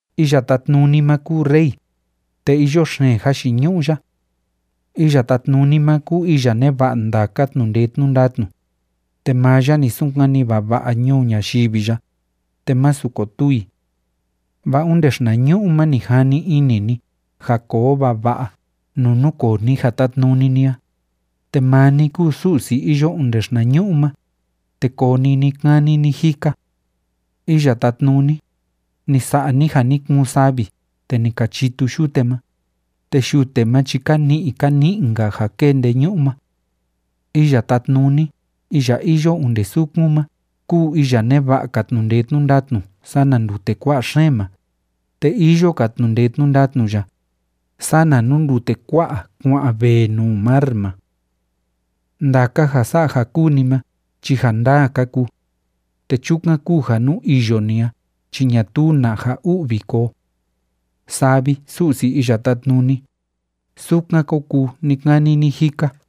Iya Tátnuni ma kúu Rey, te iyo xeen jayiñu'u ya. Iya Tátnuni ma kúu iya neva'a ndaka tnu'u ndee tnu'u ndatnu, te maa ya ni sunkani vava'a ñuu ñayivi ya, te másu kotuu i. Vaa onde xinañu'u ma ni jani ini ni ja koo vava'a nuu núkoo ni ja tátnuni ni a, te maa ni kúu Su'si iyo onde xinañu'u ma, te koo ni ni‑kani ni‑jika. Iya Tátnuni, ni sa'a ni ja ni kuun savi te ni ka chitu yute ma, te yute ma chi ka ni'i ka ni'i‑nka ja kée ndeñu'u ma. Iya Tátnuni iya iyo onde sukun ma kúu iya neva'a‑ka tnu'u ndee tnu'u ndatnu sana ndute kua'a xeen ma, te iyo‑ka tnu'u ndee tnu'u ndatnu ya sana nuu ndute kua'a kuá'an vee nuu mar ma. Ndaka ja sa'a ja kúu ni ma chi ja ndaa ka kuu, te chukan kúu ja nuu iyo ni a chi ñatuu na ja u'vi koo. Saa vi, Su'si Iya Tátnuni, sukan kó kuu ni‑kani ni‑jika.